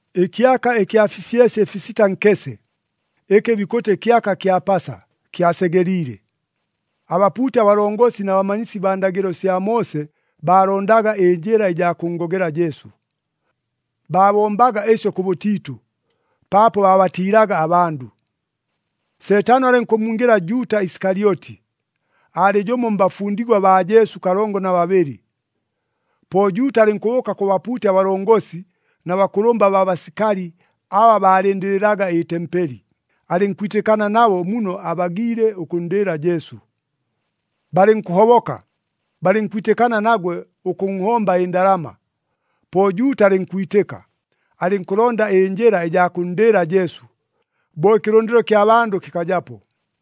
Ɨkyaka ɨkya fisyesye ɨfisita nkese, ɨkɨ bikʉtɨ kyaka kya Pasa, kyasegeliile. Abapuuti abalongosi na bamanyisi baa ndagɨlo sya Moose baalondaga ɨnjɨla ɨjaa kʉnngogela Jesu. Baabombaga ɨsyo kʉbʉtiitʉ, paapo baabatiilaga abandʉ. Seetano alɨnkʉmmwingɨla Juuta Isikalyoti, aalɨ jʉmo mbafundigwa baa Jesu kalongo na babɨlɨ. Po Juuta alɨnkʉbʉʉka kʉ bapuuti abalongosi na bakʉlʉmba baa basikali aba baalɨndɨlɨlaga ɨtempeli, alɨnkwitɨkana nabo muno abagiile ʉkʉnndɨɨla Jesu. Balɨnkʉhoboka, balɨnkwitɨkana nagwe ʉkʉnhomba ɨndalama. Po Juuta alɨnkwitɨka, alɨnkʉlonda ɨnjɨla ɨjaa kʉnndɨɨla Jesu, bo ɨkɨlʉndɨlo kya bandʉ kɨkajapo.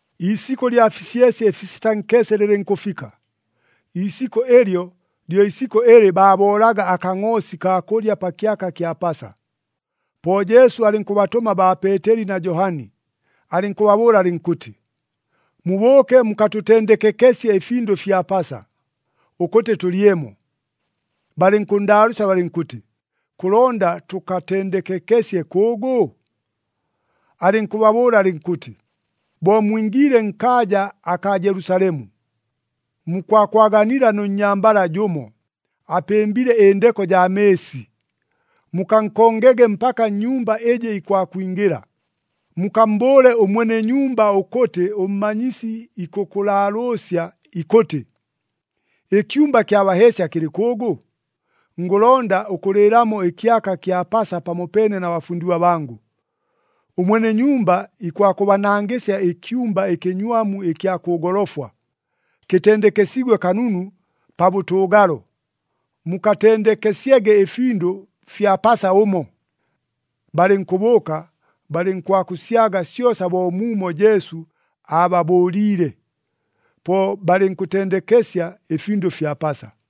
Iisikʉ lya fisyesye ɨfisita nkese lɨlɨnkʉfika. Iisikʉ ɨlyo lyo isikʉ ɨlɨ baaboolaga akangʼoosi kaa kʉlya pa kyaka kya Pasa. Po Jesu alɨnkʉbatʉma baa Peeteli na Johani, alɨnkʉbabʉʉla alɨnkʉtɨ, “Mubʉʉke mukatʉtendekekesye ɨfindʉ fya Pasa, ʉkʉtɨ tʉlyemo.” Balɨnkʉnndaalʉʉsya balɨnkʉtɨ, “Kʉlonda tʉkatendekekesye kʉʉgʉ?” Alɨnkʉbabʉʉla alɨnkʉtɨ, “Bo mwingiile nkaaja akaa Jelusalemu, mukwakwaganila nʉ nnyambala jʉmo, apɨmbile ɨndeko jaa mɨɨsi. Mukankongege mpaka nnyumba ɨjɨ ikwakwingɨla. Mukammbʉʉle ʉmwene nyumba ʉkʉtɨ ʉMmanyisi ikʉkʉlaalʉʉsya ikʉtɨ, ‘Ɨkyumba kya baheesya kɨlɨ kʉʉgʉ? Ngʉlonda ʉkʉlɨɨlamo ɨkyaka kya Pasa pamopeene na bafundigwa bangʉ.’ Ʉmwene nyumba ikwakʉbanangɨsya ɨkyumba ɨkɨnywamu ɨkya kʉ golofwa, kɨtendekesiigwe kanunu pa bʉtʉʉgalo, mukatendekesyege ɨfindʉ fya Pasa ʉmo.” Balɨnkʉbʉʉka, balɨnkwakʉsyaga syosa bo muumo Jesu aababʉʉliile. Po balɨnkʉtendekesya ɨfindʉ fya Pasa.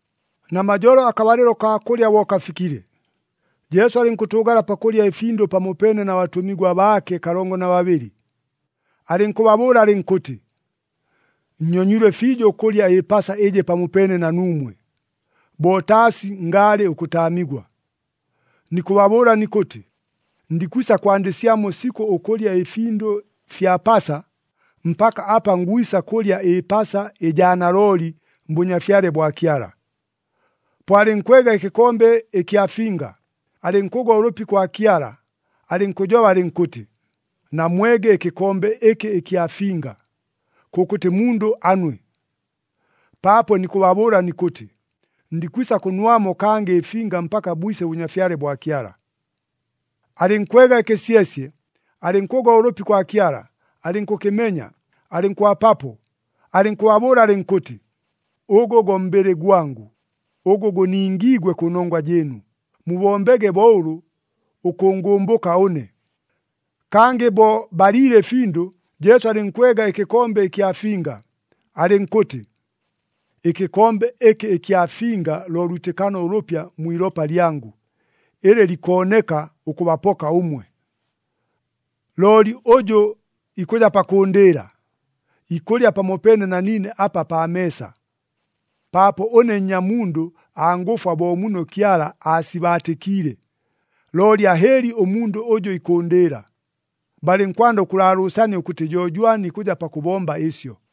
Namajolo akabalɨlo kaa kʉlya bo kafikile, Jesu alɨnkʉtʉʉgala pakʉlya ɨfindʉ pamopeene na batʉmigwa baake kalongo na babɨlɨ. Alɨnkʉbabʉʉla alɨnkʉtɨ, “Nnyonyilwe fiijo ʉkʉlya ɨPasa ɨjɨ pamopeene na nuumwe, bo taasi ngaalɨ ʉkʉtaamigwa. Nikʉbabʉʉla nikʉtɨ, ndikwisa kwandɨsyamo sikʉ ʉkʉlya ɨfindʉ fya Pasa, mpaka apa ngwisa kʉlya ɨPasa ɨjaa nalooli mBʉnyafyale bwa Kyala.” Po alɨnkwega ɨkɨkombe ɨkya finga, alɨnkʉgwa ʉlʉpi kwa Kyala, alɨnkʉjoba alɨnkʉtɨ, “Namwege ɨkɨkombe ɨkɨ ɨkya finga, kʉkʉtɨ mundʉ anwe! Paapo nikʉbabʉʉla nikʉtɨ, ndikwisa kʉnwamo kangɨ ɨfinga mpaka bwise ʉBʉnyafyale bwa Kyala.” Alɨnkwega ɨkɨsyesye, alɨnkʉgwa ʉlʉpi kwa Kyala, alɨnkʉkɨmenya, alɨnkʉbapapo, alɨnkʉbabʉʉla alɨnkʉtɨ, “Ʉgʉ go mbɨlɨ gwangʉ, ʉgʉ gʉningiigwe kʉnongwa jɨɨnu. Mubombege bo ʉlʉ ʉkʉngʉmbʉka ʉne.” Kangɨ bo baliile ɨfindʉ, Jesu alɨnkwega ɨkɨkombe ɨkya finga, alɨnkʉtɨ, “Ɨkɨkombe ɨkɨ ɨkya finga lo lwitɨkano ʉlʉpya mwi ilopa lyangʉ, ɨlɨ likooneka ʉkʉbapoka ʉmwe. “Looli ʉjʉ ikʉja pakʉʉndɨɨla, ikʉlya pamopeene na niine apa pa meesa. Paapo ʉne Nnyamundʉ angʉfwa bo muno Kyala aasibaatɨkiile, looli ahɨɨli ʉmundʉ ʉjʉ ikʉʉndɨɨla!” Balɨnkwanda ʉkʉlaalʉʉsania ʉkʉtɨ jo jwani ikʉja pakʉbomba ɨsyo.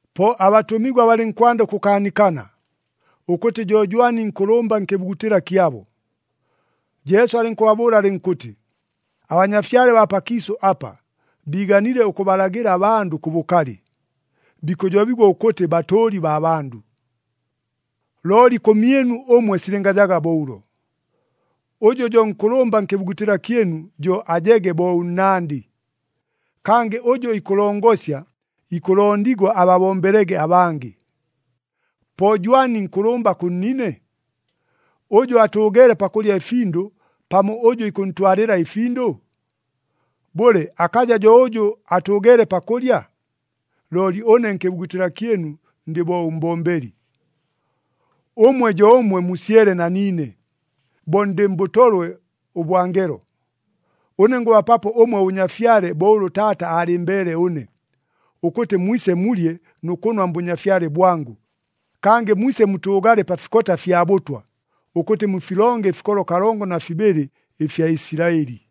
Po abatʉmigwa balɨnkwanda ʉkʉkaanikana, ʉkʉtɨ jo jwani nkʉlʉmba nkɨbugutɨla kyabo. Jesu alɨnkʉbabʉʉla alɨnkʉtɨ, “Abanyafyale baa pakiisʉ apa biiganile ʉkʉbalagɨla abandʉ kʉ bʉkalɨ, bikʉjobigwa ʉkʉtɨ batʉʉli baa bandʉ. “Looli kʉmyɨnu ʉmwe silɨngajaga bo ʉlo. Ʉjʉ jo nkʉlʉmba nkɨbugutɨla kyɨnu, jo ajege bo ʉnnandɨ. Kangɨ ʉjʉ ikʉlongosya, ikʉlondigwa ababombelege abangɨ. Po jwani nkʉlʉmba kʉ nnine? Ʉjʉ atʉʉgeele pakʉlya ɨfindʉ pamo ʉjʉ ikʉntwalɨla ɨfindʉ? Bʉle, akaja jo ʉjʉ atʉʉgeele pakʉlya? Looli ʉne nkɨbugutɨla kyɨnu ndɨ bo ʉmbombeli. “Ʉmwe jo ʉmwe musyele na niine, bo ndɨ mbʉtolwe ʉbwa ngelo. Ʉne ngʉbapapo ʉmwe ʉBʉnyafyale bo ʉlʉ Taata aalɨmbeele ʉne, ʉkʉtɨ mwise mulye nʉ kʉnwa mBʉnyafyale bwangʉ, kangɨ mwise mutʉʉgale pa fikota fya bʉtwa, ʉkʉtɨ mufilonge ɨfikolo kalongo na fibɨlɨ ɨfya Isilaɨli.”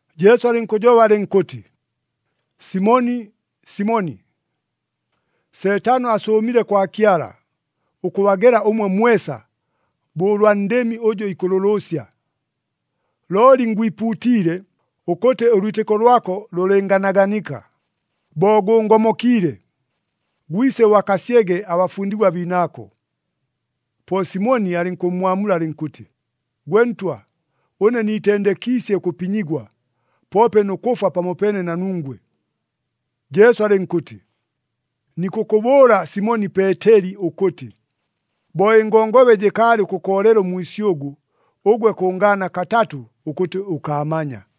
Jesu alɨnkʉjoba alɨnkʉtɨ, “Simoni, Simoni! Seetano asʉʉmile kwa Kyala, ʉkʉbagela ʉmwe mwesa, bo ʉlwa ndɨmi ʉjʉ ikʉlʉlʉʉsya. Looli ngwipuutiile, ʉkʉtɨ ʉlwitɨko lwako lʉlɨnganaganika. Bo gʉʉngomokiile, gwise ʉbakasyege abafundigwa biinaako.” Po Simoni alɨnkʉmmwamula alɨnkʉtɨ, “Gwe Ntwa, ʉne niitendekiisye ʉkʉpinyigwa, poope nʉ kʉfwa pamopeene na nungwe!” Jesu alɨnkʉtɨ, “Nikʉkʉbʉʉla Simoni Peeteli ʉkʉtɨ, bo ɨngongobe jɨkaalɨ ʉkʉkoolela ʉmwisyʉgʉ, ʉgwe kʉngaana katatʉ ʉkʉtɨ ʉkaamanya.”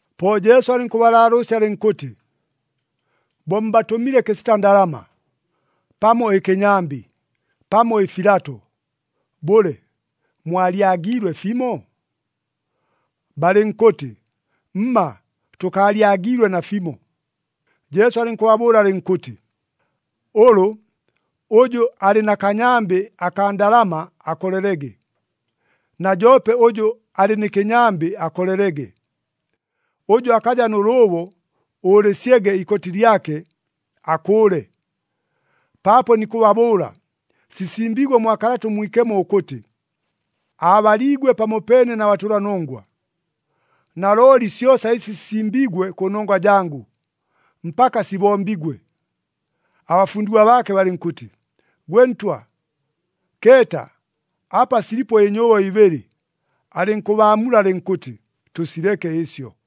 Po Jesu alɨnkʉbalaalʉʉsya alɨnkʉtɨ, “Bo mbatʉmile kɨsita ndalama, pamo ɨkɨnyambɨ, pamo ɨfilato, bʉle, mwalyagiilwe fimo?” Balɨnkʉtɨ, “Mma, tʉkaalyagiilwe nafimo.” Jesu alɨnkʉbabʉʉla alɨnkʉtɨ, “Ʉlʉ, ʉjʉ alɨ na kanyambɨ akaa ndalama akolelege, na joope ʉjʉ alɨ nɨ kɨnyambɨ akolelege. Ʉjʉ akaja nʉ lʉʉbo, ʉʉlɨsyege ikoti lyake, akʉʉle. Paapo nikʉbabʉʉla, sisimbiigwe mwa Kalata ʉMwikemo ʉkʉtɨ, ‘Aabaliigwe pamopeene na batʉlanongwa.’ Nalooli syosa ɨsi sisimbiigwe kʉnongwa jangʉ, mpaka sibombigwe.” Abafundigwa baake balɨnkʉtɨ, “Gwe Ntwa, keeta, apa silipo ɨnyʉʉbo ibɨlɨ.” Alɨnkʉbaamula alɨnkʉtɨ, “Tʉsileke ɨsyo.”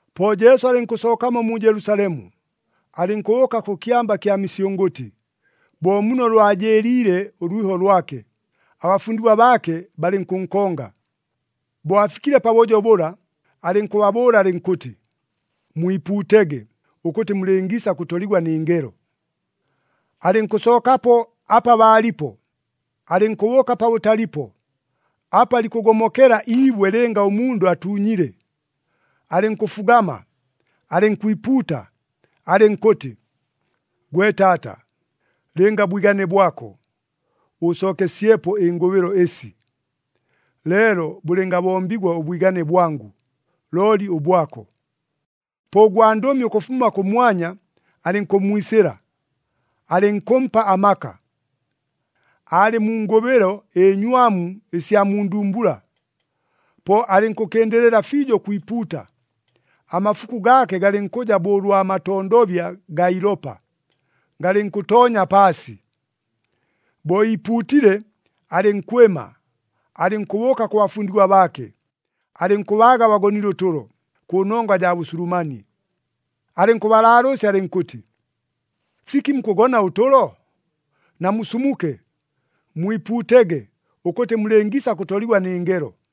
Po Jesu alɨnkʉsookamo mu Jelusalemu, alɨnkʉbʉʉka kʉ Kyamba kya Misyʉngʉtɨ, bo muno lwajɨɨliile ʉlwiho lwake, abafundigwa baake balɨnkʉnkonga. Bo afikile pabʉjo bʉla, alɨnkʉbabʉʉla alɨnkʉtɨ, “Mwipuutege, ʉkʉtɨ mulɨngiisa kʉtoligwa nɨ ngelo.” Alɨnkʉsookapo apa baalipo, alɨnkʉbʉʉka pabʉtalipo, apa likʉgomokela iibwe lɨnga ʉmundʉ atuunyile. Alɨnkʉfugama, alɨnkwipuuta, alɨnkʉtɨ, “Gwe Taata! Lɨnga bwigane bwako, ʉʉsookesyepo ɨngʉbɨlo ɨsi. Leelo bʉlɨngabombigwa ʉbwigane bwangʉ, looli ʉbwako!” [ Po ʉgwandʉmi ʉkʉfuma kʉmwanya alɨnkʉmmwisɨla, alɨnkʉmpa amaka. Aalɨ mu ngʉbɨlo ɨnywamu ɨsya mu ndumbula, po alɨnkʉkɨndɨlɨla fiijo ʉkwipuuta, amafuku gaake galɨnkʉja bo ʉlwa matondobya gaa ilopa, galɨnkʉtoonya paasi.] Bo iipuutile, alɨnkwɨma, alɨnkʉbʉʉka kʉ bafundigwa baake, alɨnkʉbaaga bagonile ʉtʉlo, kʉnongwa jaa bʉsulumanie. Alɨnkʉbalaalʉʉsya alɨnkʉtɨ, “Fiki mukʉgona ʉtʉlo? Namusumuke! Mwipuutege, ʉkʉtɨ mulɨngiisa kʉtoligwa nɨ ngelo.”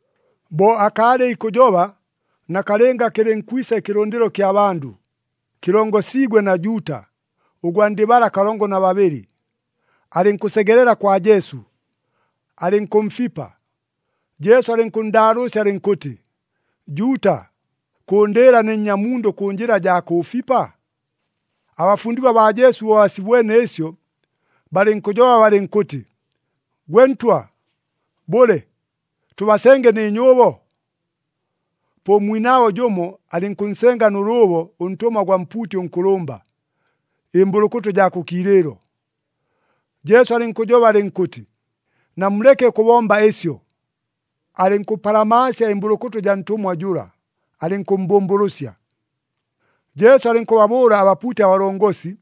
Bo akaalɨ ikʉjoba, nakalɨnga kɨlɨnkwisa ɨkɨlʉndɨlo kya bandʉ, kɨlongosiigwe na Juuta, ʉgwa ndɨ bala kalongo na babɨlɨ. Alɨnkʉsegelela kwa Jesu, alɨnkʉmfipa. Jesu alɨnkʉnndaalʉʉsya alɨnkʉtɨ, “Juuta! Kʉʉndɨɨla ne Nnyamundʉ kʉ njɨla jaa kʉʉfipa?” Abafundigwa baa Jesu bo basibwene ɨsyo, balɨnkʉjoba balɨnkʉtɨ, “Gwe Ntwa! Bʉle, tʉbasenge nɨ nyʉʉbo?” Po ʉmwinaabo jʉmo alɨnkʉnsenga nʉ lʉʉbo ʉntʉmwa gwa mpuuti ʉnkʉlʉmba, ɨmbʉlʉkʉtʉ jaa kʉ kiilɨɨlo. Jesu alɨnkʉjoba alɨnkʉtɨ, “Namuleke ʉkʉbomba ɨsyo!” Alɨnkʉpalamaasya ɨmbʉlʉkʉtʉ jaa ntʉmwa jʉla, alɨnkʉmmbʉmbʉlʉsya. Jesu alɨnkʉbabʉʉla abapuuti abalongosi,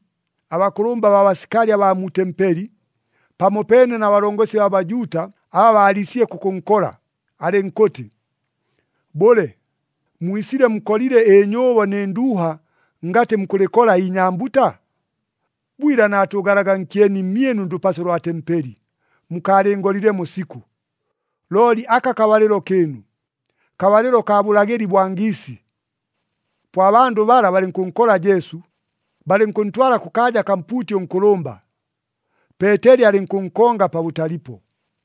abakʉlʉmba baa basikali abaa mu tempeli, pamopeene na balongosi baa Bajuuta, aba baaliisile kʉkʉnkola, alɨnkʉtɨ, “Bʉle, mwisile mukolile ɨnyʉʉbo nɨ nduuha ngatɨ mukʉlɨkola inyambuta? Bwila naatʉʉgalaga nkyeni mmyɨnu ndʉpaso lwa tempeli, mukaalɨngolilemo sikʉ! Looli aka kabalɨlo kɨɨnu, kabalɨlo kaa bʉlagɨli bwa ngiisi.” Po abandʉ bala balɨnkʉnkola Jesu, balɨnkʉntwala kʉkaaja kaa mpuuti ʉnkʉlʉmba. Peeteli alɨnkʉnkonga pabʉtalipo.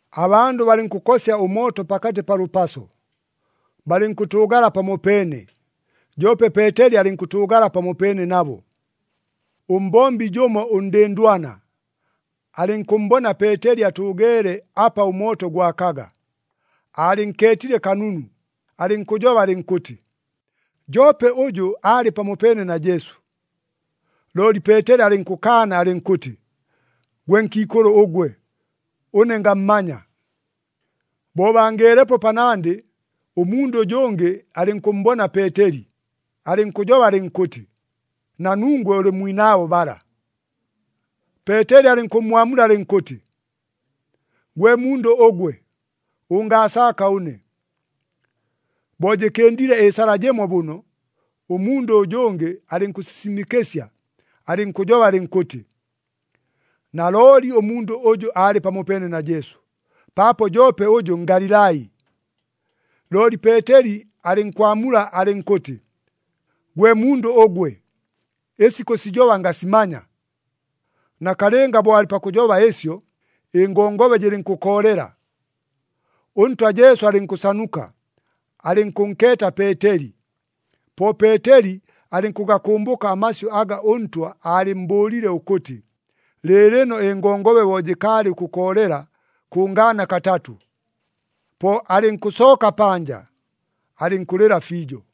Abandʉ balɨnkʉkosya ʉmooto pakatɨ pa lʉpaso, balɨnkʉtʉʉgala pamopeene, joope Peeteli alɨnkʉtʉʉgala pamopeene nabo. Ʉmbombi jʉmo ʉndɨndwana, alɨnkʉmmbona Peeteli atʉʉgeele apa ʉmooto gwakaga, aalɨnkeetile kanunu, alɨnkʉjoba alɨnkʉtɨ, “Joope ʉjʉ, aalɨ pamopeene na Jesu.” Looli Peeteli alɨnkʉkaana alɨnkʉtɨ, “Gwe nkiikʉlʉ ʉgwe! Ʉne ngammanya!” Bo bangeelepo panandɨ, ʉmundʉ ʉjʉngɨ alɨnkʉmmbona Peeteli, alɨnkʉjoba alɨnkʉtɨ, “Na nungwe ʉlɨ mwinaabo bala.” Peeteli alɨnkʉmmwamula alɨnkʉtɨ, “Gwe mundʉ ʉgwe, ʉngaasaaka ʉne!” Bo jɨkɨndile ɨsala jɨmo bʉno, ʉmundʉ ʉjʉngɨ alɨnkʉsisimɨkɨsya, alɨnkʉjoba alɨnkʉtɨ, “Nalooli ʉmundʉ ʉjʉ aalɨ pamopeene na Jesu! Paapo joope ʉjʉ Ngalilai!” Looli Peeteli alɨnkwamula alɨnkʉtɨ, “Gwe mundʉ ʉgwe, ɨsi kʉsijoba ngasimanya!” Nakalɨnga bo alɨ pakʉjoba ɨsyo, ɨngongobe jɨlɨnkʉkoolela. ɄNtwa Jesu alɨnkʉsanuka, alɨnkʉnkeeta Peeteli. Po Peeteli alɨnkʉgakʉmbʉka amasyʉ aga ʉNtwa aalɨmmbʉʉlile ʉkʉtɨ, “Lɨɨlɨno ɨngongobe bo jɨkaalɨ ʉkʉkoolela, kʉngaana katatʉ.” Po alɨnkʉsooka panja, alɨnkʉlɨla fiijo.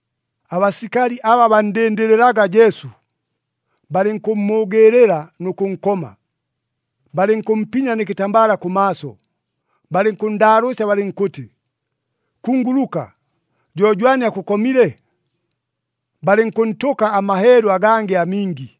Abasikali aba banndɨndɨlɨlaga Jesu, balɨnkʉmmʉʉgɨɨlɨla nʉ kʉnkoma. Balɨnkʉmpinya nɨ kɨtambala kʉmaaso, balɨnkʉnndaalʉʉsya balɨnkʉtɨ, “Kunguluka! Jo jwani akʉkomile?” Balɨnkʉntʉka amaheelu agangɨ amingi.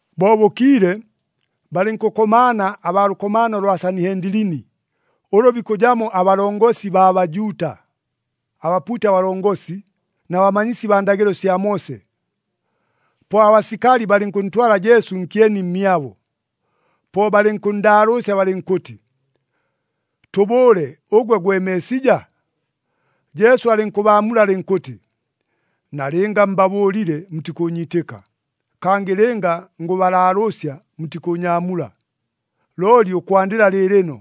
Bo bʉkiile, balɨnkʉkomaana abaa lʉkomaano lwa Sanihendilini, ʉlʉ bikʉjamo abalongosi baa Bajuuta, abapuuti abalongosi, na bamanyisi baa ndagɨlo sya Moose. Po abasikali balɨnkʉntwala Jesu nkyeni mmyabo. Po balɨnkʉnndaalʉʉsya balɨnkʉtɨ, “Tʉbʉʉle, ʉgwe gwe Meesija?” Jesu alɨnkʉbaamula alɨnkʉtɨ, “Nalɨnga mbabʉʉlile, mutikʉʉnyiitɨka. Kangɨ lɨnga ngʉbalaalʉʉsya, mutikʉʉnyaamula. Looli ʉkwandɨla lɨɨlɨno,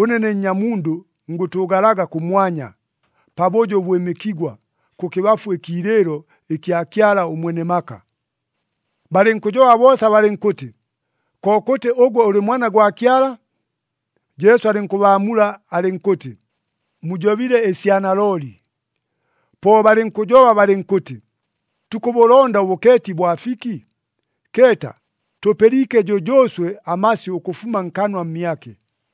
ʉne ne Nnyamundʉ ngʉtʉʉgalaga kʉmwanya, pabʉjo ʉbwɨmɨkigwa, kʉkɨbafu ɨkiilɨɨlo ɨkya Kyala ʉMwene maka.” Balɨnkʉjoba boosa balɨnkʉtɨ, “Kokʉtɨ ʉgwe ʉlɨ Mwana gwa Kyala?” Jesu alɨnkʉbaamula alɨnkʉtɨ, “Mujobile ɨsya nalooli.” Po balɨnkʉjoba balɨnkʉtɨ, “Tukʉbʉlonda ʉbʉkeeti bwa fiki? Keeta, tʉpɨliike jʉjʉʉswe amasyʉ ʉkʉfuma nkanwa mmyake!”